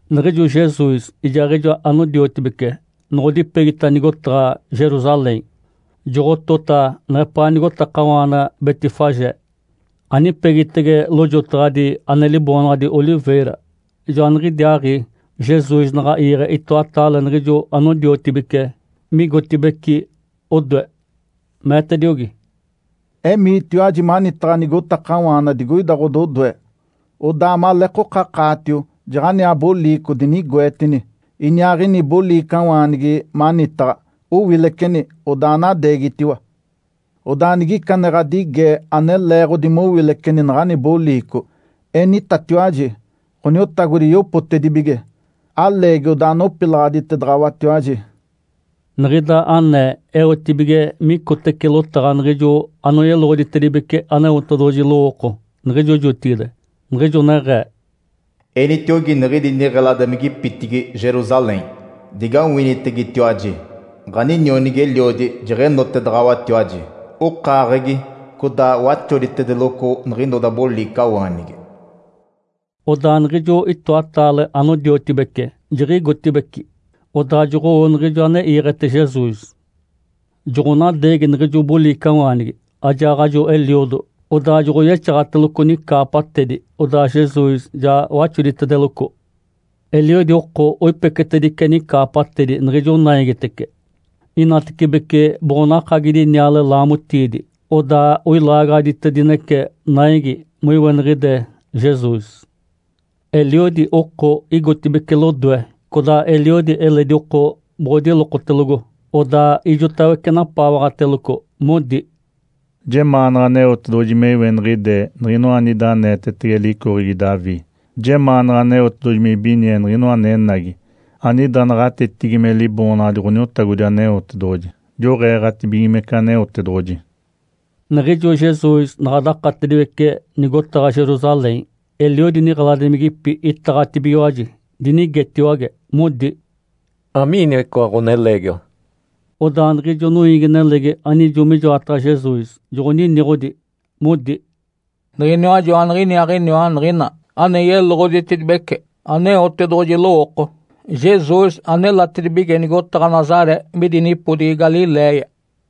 Niɡ̶ijo Jesus ijaaɡ̶ijo anodiotibece noɡ̶odipegita nigotaɡ̶a Jerusalém, joɡ̶otota neɡ̶epaa nigotakawaana Betfagé, anipegitege lojotaɡ̶adi ane liboonaɡ̶adi “Oliveira”. Joaniɡ̶idiaaɡ̶i Jesus naɡ̶a iiɡ̶e itoataale niɡ̶ijo anodiotibece migotibeci odoe. Meetediogi, “Emiitiwaji manitaɡ̶a nigotakawaana digoida ɡ̶ododoe, odaa maleekokakaatio jaɡ̶aniaa boliico dinigoetini, iniaaɡ̶ini boliicawaanigi manitaɡ̶a. Owileceni, odaa anadeegitediwa! Odaa nigica ane ɡ̶adige ane leeɡ̶odi mowileceni naɡ̶ani boliico, enitatiwaji, ‘Ǥoniotagodi yopotedibige. Aleegi odaa nopilaɡ̶aditedaɡ̶awatiwaji.’” Niɡ̶ida anee eotibige micotece lotaɡ̶a niɡ̶ijo ane yeloɡ̶oditedibece Aneotedoɡ̶oji lowooko niɡ̶ijo jotigide, niɡ̶ijo neɡ̶ee, “Enitiogi niɡ̶idi niɡ̶eladimigipitigi Jerusalém, ‘Digawinitegetiwaji! Ǥaninionigi-eliodi jeɡ̶enotedaɡ̶awatiwaji. Okaaɡ̶egi, codaa waxoditedeloco niɡ̶inoda boliicawaanigi.’” Odaa niɡ̶ijo itoataale anodiotibece jiɡ̶igotibeci, odaa joɡ̶owo niɡ̶ijo ane iiɡ̶ete Jesus. Joɡ̶onadeegi niɡ̶ijo boliicawaanigi ajaaɡ̶ajo eliodo, odaa joɡ̶oyexaɡ̶ateloco nicaapatedi, odaa Jesus ja waxoditedeloco. Eliodi oko oipecetedice nicaapatedi niɡ̶ijo naigitece, inatecibece boɡ̶onakagidi niale laamotiidi, odaa oilaagaɡ̶aditedinece naigi moiweniɡ̶ide Jesus. Eliodi oko igotibeci lodoe, codaa eliodi eledi oko boɡ̶odilokotelogo, odaa ijotawece napaawaɡ̶ateloco, modi, “Jemaanaɡ̶a Aneotedoɡ̶oji me iweniɡ̶ide Niɡ̶inoa anida aneetetege licoɡ̶egi Davi! Jemaanaɡ̶a Aneotedoɡ̶oji me ibinie Niɡ̶inoa anenagi anida naɡ̶atetigi me Liboonaɡ̶adi Ǥoniotagodi Aneotedoɡ̶oji! Joɡ̶eeɡ̶atibigimece Aneotedoɡ̶oji!” Niɡ̶ijo Jesus naɡ̶a dakatediwece nigotaɡ̶a Jerusalém, eliodi niɡ̶eladimigipi itaɡ̶atibigiwaji, dinigetiwage, modi, “Amiiniwa icoa ɡ̶oneleegiwa?” Odaa niɡ̶ijo noiigi-nelegi anijo mijoataɡ̶a Jesus joɡ̶oniniɡ̶odi, modi, “Niɡ̶iniwa joaniɡ̶iniaaɡ̶iniwa Niɡ̶ina ane yeloɡ̶oditedibece Aneotedoɡ̶oji lowooko, Jesus, anelatedibige nigotaɡ̶a Nazaré midi nipodigi Galiléia.”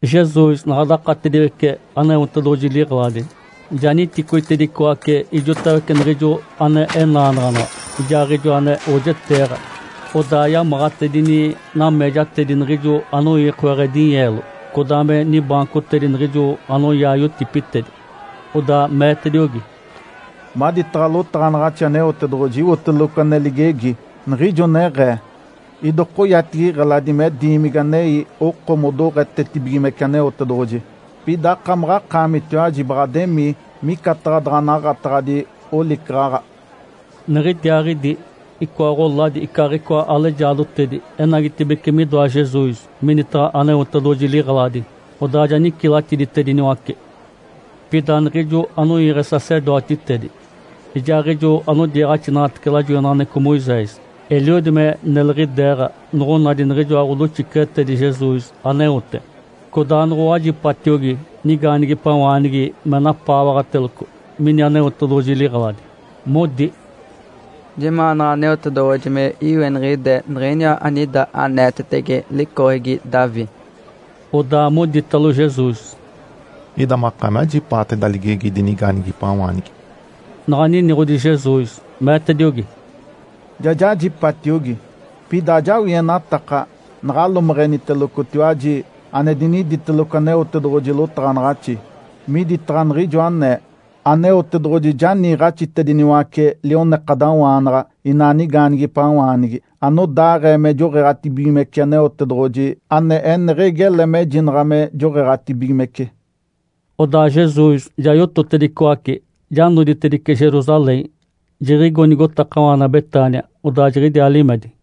Jesus naɡ̶a dakatediwece Aneotedoɡ̶oji liɡ̶eladi, ja niticoitedicoace ijotawece niɡ̶ijo ane enaanaɡ̶anaɡ̶a ijaaɡ̶ijo ane oojeteeɡ̶a. Odaa yamaɡ̶atedini nameejatedi niɡ̶ijo anoiikoaɡ̶e dinyeelo, codaa me nibaancotedi niɡ̶ijo anoyaa yotipitedi. Odaa meetediogi, “Maditaɡ̶a lotaɡ̶anaɡ̶axi Aneotedoɡ̶oji, iwoteloco ane ligegi, niɡ̶ijo neɡ̶ee, ‘Idokoyatigi iɡ̶eladi me diimigi anei oko modoɡ̶etetibigimece Aneotedoɡ̶oji.’ Pida akamaɡ̶akaamitiwaji baɡ̶ademii micataɡ̶a daɡ̶a naɡ̶ataɡ̶adi olicaɡ̶aɡ̶a.” Niɡ̶idiaaɡ̶idi icoa ɡ̶oladi icaaɡ̶icoa alejaadotedi enagitibeci midoa Jesus minitaɡ̶a Aneotedoɡ̶oji liɡ̶eladi, odaa ja nicilatiditediniwace. Pida niɡ̶ijo anoiiɡ̶e sacerdotitedi ijaaɡ̶ijo anodiiɡ̶axinaɡ̶atece lajoinaɡ̶aneɡ̶eco Moisés, eliodi me neliɡ̶ideeɡ̶a, noɡ̶onadi niɡ̶ijoa ɡ̶odoxiceɡ̶etedi Jesus aneote, codaa noɡ̶owajipatiogi nigaanigipawaanigi me napaawaɡ̶ateloco mini Aneotedoɡ̶oji liɡ̶eladi, modi, “Jemaanaɡ̶a Aneotedoɡ̶oji me iweniɡ̶ide Niɡ̶iniwa anida aneetetege licoɡ̶egi Davi!” Odaa moditalo Jesus, “Ida makaami ajipaata ida ligegi idi nigaanigipawaanigi?” Naɡ̶a niniɡ̶odi Jesus, meetediogi, “Ja jajipatiogi. Pida ajawienataka naɡ̶alomeɡ̶enitelocotiwaji ane diniditeloco Aneotedoɡ̶oji lotaɡ̶anaɡ̶axi, miditaɡ̶a niɡ̶ijo anee, ‘Aneotedoɡ̶oji ja niiɡ̶axitediniwace lionekadawaanaɡ̶a inaa nigaanigipawaanigi anodaaɡ̶ee me joɡ̶eeɡ̶atibigimece Aneotedoɡ̶oji ane eneɡ̶egi ele mejinaɡ̶a me joɡ̶eeɡ̶atibigimece.’” Odaa Jesus ja yototedicoace, ja noditedice Jerusalém, jiɡ̶igo nigotakawaana Betânia. Odaa jiɡ̶idiaa limedi.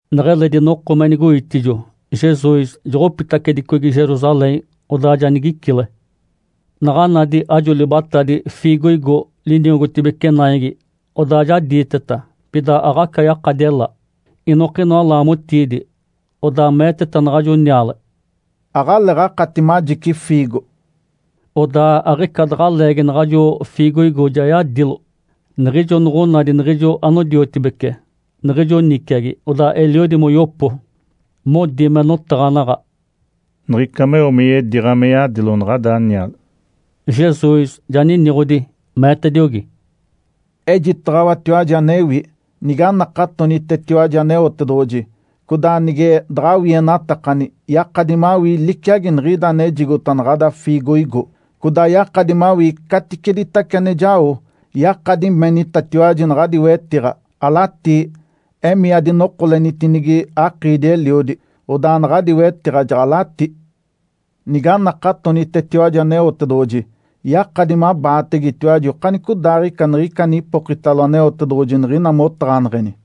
Neɡ̶eledi noko me nigoitijo, Jesus joɡ̶opitacedicogi Jerusalém, odaa ja nigicile. Naɡ̶a nadi ajo libatadi “fiigoigo” liniogotibece naigi, odaa ja diiteta. Pida aɡ̶aca yakadi ela, inokinoa laamotiidi. Odaa meeteta naɡ̶ajo niale, “Aɡ̶aleeɡ̶akati majici fiigo!” Odaa aɡ̶ica daɡ̶a leegi naɡ̶ajo fiigoigo ja yadilo. Niɡ̶ijo noɡ̶onadi niɡ̶ijo anodiotibece niɡ̶ijo niciagi, odaa eliodi moyopo, modi me notaɡ̶anaɡ̶a, “Niɡ̶ica meo me yediiɡ̶a me yadilo naɡ̶ada niale!” Jesus ja niniɡ̶odi, meetediogi, “Ejitaɡ̶awatiwaji anewi. Niganakatonitetiwaji Aneotedoɡ̶oji, codaa nige daɡ̶awienatakani, yakadi mawii liciagi niɡ̶ida anejigota naɡ̶ada fiigoigo, codaa yakadi mawii caticeditace ane jao. Yakadi menitatiwaji naɡ̶adi wetiɡ̶a, ‘Alatii, emii adinokolenitinigi akiidi-eliodi!’ Odaa naɡ̶adi wetiɡ̶a jaɡ̶alatí. Niganakatonitetiwaji Aneotedoɡ̶oji, yakadi mabaategetiwaji okanicodaaɡ̶ica niɡ̶ica anipokitalo Aneotedoɡ̶oji niɡ̶ina motaɡ̶aneɡ̶eni.”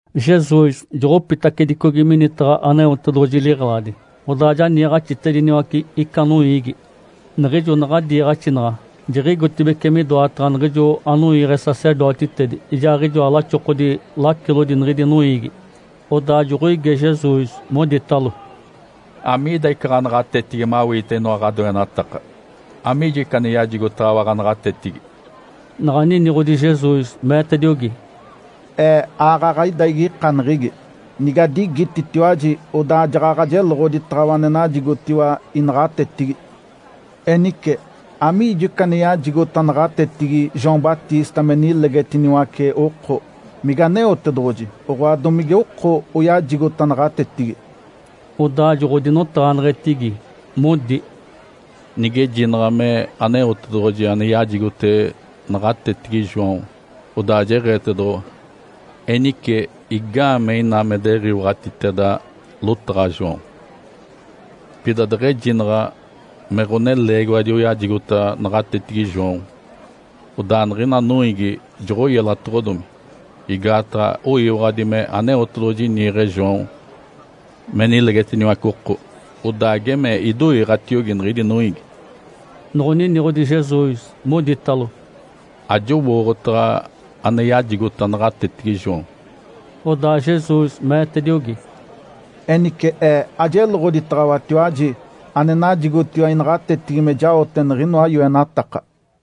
Jesus joɡ̶opitacedicogi minitaɡ̶a Aneotedoɡ̶oji liɡ̶eladi, odaa ja niiɡ̶axitediniwace ica noiigi. Niɡ̶ijo naɡ̶a diiɡ̶axinaɡ̶a, jiɡ̶igotibeci midoataɡ̶a niɡ̶ijo anoiiɡ̶e sacerdotitedi ijaaɡ̶ijoa laxokodi lacilodi niɡ̶idi noiigi. Odaa joɡ̶oige Jesus, moditalo, “Amiida ica ɡ̶anaɡ̶atetigi mawiite inoa ane ɡ̶adoenataka? Amiijo ica ane yajigotaɡ̶awa ɡ̶anaɡ̶atetigi?” Naɡ̶a niniɡ̶odi Jesus, meetediogi, “Ee aaɡ̶aɡ̶a ida igikaneɡ̶egi. Nigadigititiwaji, odaa jaɡ̶aɡ̶a jeloɡ̶oditaɡ̶awa ane najigotiwa inaɡ̶atetigi. Enice, amiijo ica ane yajigota naɡ̶atetigi João Batista me nilegetiniwace oko? Mige Aneotedoɡ̶oji, oɡ̶oa, domige oko oyajigota naɡ̶atetigi?” Odaa joɡ̶odinotaɡ̶aneɡ̶etigi, modi, “Nigejinaɡ̶a me Aneotedoɡ̶oji ane yajigote naɡ̶atetigi João, odaa jeɡ̶eetedoɡ̶owa, ‘Enice, igaamee ina me diɡ̶iwaɡ̶atiteda lotaɡ̶a João?’ Pida deɡ̶ejinaɡ̶a, ‘Me ɡ̶oneleegiwadi oyajigota naɡ̶atetigi João.’ Odaa niɡ̶ina noiigi joɡ̶oyelatoɡ̶odomi, igaataɡ̶a oyiwaɡ̶adi me Aneotedoɡ̶oji niiɡ̶e João me nilegetiniwace oko, odaa geme idoiiɡ̶atiogi niɡ̶idi noiigi.” Noɡ̶oniniɡ̶odi Jesus, moditalo, “Ajowooɡ̶otaɡ̶a ane yajigota naɡ̶atetigi João.” Odaa Jesus meetediogi, “Enice Ee ajeloɡ̶oditaɡ̶awatiwaji ane najigotiwa inaɡ̶atetigi me jaote niɡ̶inoa yoenataka.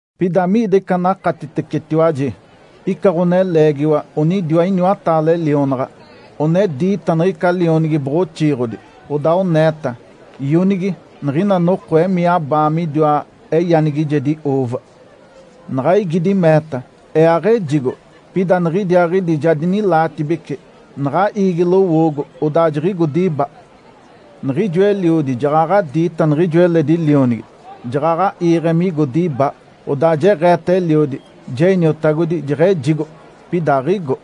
Pida amiida ica anakatitecetiwaji? Ica ɡ̶oneleegiwa onidiwa iniwataale lionaɡ̶a. One diita niɡ̶ica lionigi boɡ̶oxiiɡ̶odi, odaa oneeta, ‘Ionigi, niɡ̶ina noko emii abaa midiwa eyanigijedi uuva!’ Naɡ̶a igidi, meeta, ‘Ee aɡ̶ejigo.’ Pida niɡ̶idiaaɡ̶idi ja dinilaatibece, naɡ̶a iigi lowoogo, odaa jiɡ̶igo diba. Niɡ̶ijo eliodi jaɡ̶aɡ̶a diita niɡ̶ijo eledi lionigi, jaɡ̶aɡ̶a iiɡ̶e migo diba. Odaa jeɡ̶eeta eliodi, ‘Je iniotagodi! Jeɡ̶ejigo.’ Pida aɡ̶igo.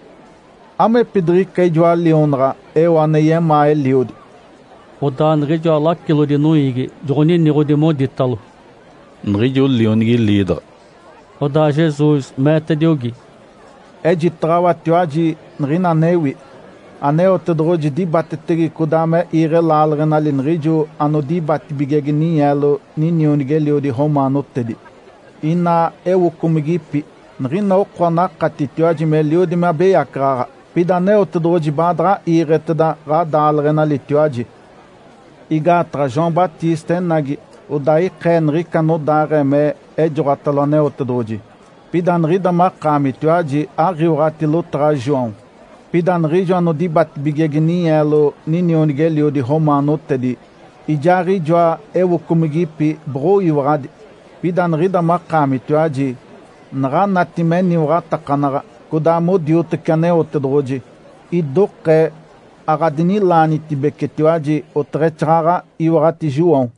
Amepidiɡ̶ica ijoa lionaɡ̶a eo ane yemaa eliodi?” Odaa niɡ̶ijoa lacilodi noiigi joɡ̶oniniɡ̶odi, moditalo, “Niɡ̶ijo lionigi liidaɡ̶a.” Odaa Jesus meetediogi, “Ejitaɡ̶awatiwaji niɡ̶ina anewi. Aneotedoɡ̶oji dibatetege codaa me iiɡ̶e laaleɡ̶enali niɡ̶ijo anodibatibigege ninyeelo ninionigi-eliodi romaanotedi, inaa ewocomigipi, niɡ̶ina oko anakatitiwaji meliodi me abeyacaɡ̶aɡ̶a, pida Aneotedoɡ̶oji baadaɡ̶a iiɡ̶eteda ɡ̶adaaleɡ̶enalitiwaji. Igaataɡ̶a João Batista enagi, odaa ikee niɡ̶ica anodaaɡ̶ee me ejoɡ̶otalo Aneotedoɡ̶oji, pida niɡ̶ida makaamitiwaji aɡ̶iwaɡ̶ati lotaɡ̶a João. Pida niɡ̶ijo anodibatibigege ninyeelo ninionigi-eliodi romaanotedi ijaaɡ̶ijoa ewocomigipi boɡ̶oyiwaɡ̶adi. Pida niɡ̶ida makaamitiwaji, naɡ̶anati me eniwaɡ̶atakanaɡ̶a codaa modiotece Aneotedoɡ̶oji, idokee aɡ̶adinilaanitibecetiwaji, oteɡ̶exaaɡ̶aɡ̶a iwaɡ̶ati João.”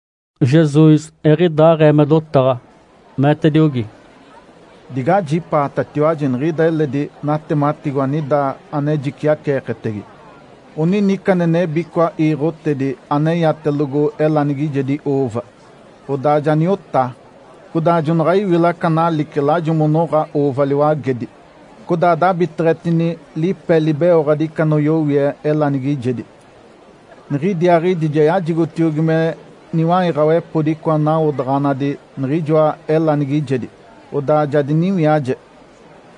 Jesus eɡ̶idaaɡ̶ee me dotaɡ̶a, meetediogi, “Digajipaatatiwaji niɡ̶ida eledi natematigo anida ane jiciaceeketege! Onini ica ane nebi icoa iiɡ̶otedi aneyatelogo elanigijedi uuva, odaa ja niotaa. Codaa jonaɡ̶a iwila aca nalice lajo monoɡ̶a uuva liwagedi, codaa dabiteɡ̶etini lipe libeoɡ̶adi ica anoyowie elanigijedi. Niɡ̶idiaaɡ̶idi ja yajigotiogi me niwaiɡ̶awepodi icoa nawodaɡ̶anadi niɡ̶ijoa elanigijedi. Odaa ja diniwiaje.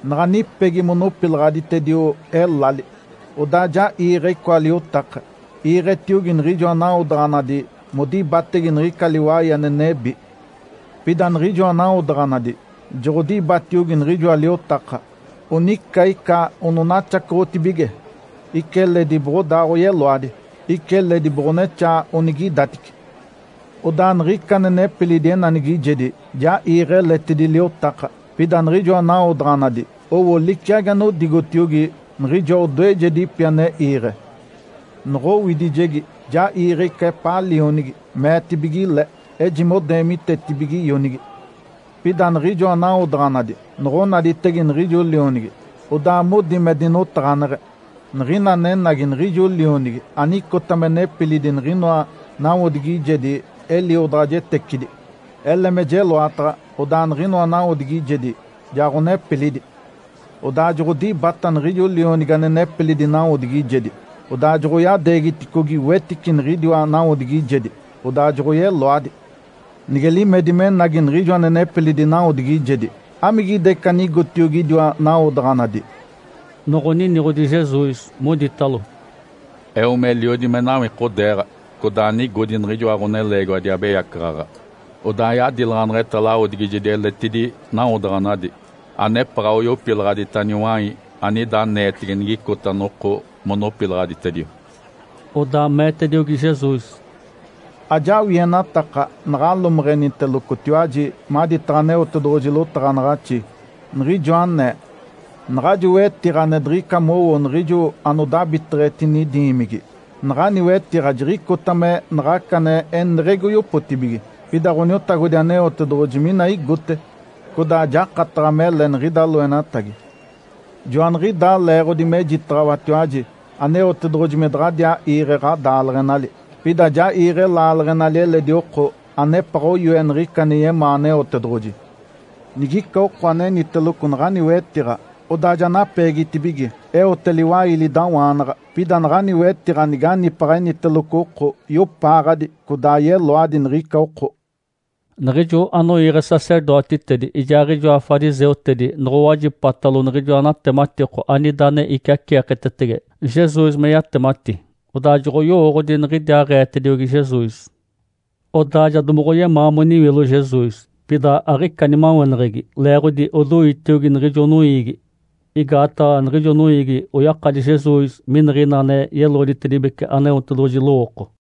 Naɡ̶a nipegi monopilaɡ̶aditedio elali, odaa ja iiɡ̶e icoa liotaka, iiɡ̶etiogi niɡ̶ijoa nawodaɡ̶anadi modibatege niɡ̶ica liwai ane nebi. Pida niɡ̶ijoa nawodaɡ̶anadi joɡ̶odibatiogi niɡ̶ijoa liotaka. Onica ica ononaxacoɡ̶otibige, ica eledi boɡ̶odaa oyeloadi, ica eledi boɡ̶onexaa onigidatice. Odaa niɡ̶ica ane nepilidi enanigijedi ja iiɡ̶e eletidi liotaka, pida niɡ̶ijoa nawodaɡ̶anadi owo liciagi anodigotiogi niɡ̶ijoa odoejedipi ane iiɡ̶e. Noɡ̶owidijegi ja iiɡ̶e ica epaa lionigi, meetibige le, ‘Ejime odeemitetibige ionigi.’ Pida niɡ̶ijoa nawodaɡ̶anadi noɡ̶onaditege niɡ̶ijo lionigi, odaa modi me dinotaɡ̶aneɡ̶e, ‘Niɡ̶ina anenagi niɡ̶ijo lionigi anicota me nepilidi niɡ̶inoa nawodigijedi eliodaɡ̶ajetecidi. Ele me jeloataɡ̶a, odaa niɡ̶inoa nawodigijedi ja ɡ̶onepilidi!’ Odaa joɡ̶odibata niɡ̶ijo lionigi ane nepilidi nawodigijedi, odaa joɡ̶oyadeegiticogi wetice niɡ̶idiwa nawodigijedi, odaa joɡ̶oyeloadi. Nige limedi menagi niɡ̶ijo ane nepilidi nawodigijedi, amigida ica anigotiogi idiwa nawodaɡ̶anadi?” Noɡ̶oniniɡ̶odi Jesus, moditalo, “Eo meliodi me nawikodeeɡ̶a codaa nigodi niɡ̶ijoa ɡ̶oneleegiwadi abeyacaɡ̶aɡ̶a. Odaa yadilaɡ̶aneɡ̶eta lawodigijedi eletidi nawodaɡ̶anadi, anepaɡ̶a oyopilaɡ̶adita niwai anida aneetege nigicota noko monopilaɡ̶aditedio.” Odaa meetediogi Jesus, “Ajawienataka naɡ̶alomeɡ̶enitelocotiwaji maditaɡ̶a Aneotedoɡ̶oji lotaɡ̶anaɡ̶axi, niɡ̶ijo anee, ‘Naɡ̶ajo wetiɡ̶a ane diɡ̶ica mowo niɡ̶ijo anodabiteɡ̶etini diimigi, naɡ̶ani wetiɡ̶a jiɡ̶icota me naɡ̶aca ane eneɡ̶egi oyopotibige. Pida Ǥoniotagodi Aneotedoɡ̶oji mina igote, codaa jakataɡ̶a mele niɡ̶ida loenatagi.’ Joaniɡ̶idaa leeɡ̶odi mejitaɡ̶awatiwaji Aneotedoɡ̶oji me daɡ̶adiaa iiɡ̶e ɡ̶adaaleɡ̶enali, pida ja iiɡ̶e laaleɡ̶enali eledi oko anepaɡ̶a oyoe niɡ̶ica ane yemaa Aneotedoɡ̶oji. Nigica oko aneniteloco naɡ̶ani wetiɡ̶a, odaa ja napeegitibige, eote liwailidawaanaɡ̶a. Pida naɡ̶ani wetiɡ̶a niganipaɡ̶a eniteloco oko, iopaaɡ̶adi codaa yeloadi niɡ̶ica oko.” Niɡ̶ijo anoiiɡ̶e sacerdotitedi ijaaɡ̶ijoa fariseutedi noɡ̶owajipatalo niɡ̶ijoa natematiko anida ane iciaceeketege Jesus meyatemati, odaa joɡ̶oyowooɡ̶odi niɡ̶idiaaɡ̶eetediogi Jesus. Odaa ja domoɡ̶oyemaa moniwilo Jesus, pida aɡ̶ica nimaweneɡ̶egi leeɡ̶odi odoitiogi niɡ̶ijo noiigi, igaataɡ̶a niɡ̶ijo noiigi oyakadi Jesus miniɡ̶ina ane yeloɡ̶oditedibece Aneotedoɡ̶oji lowooko.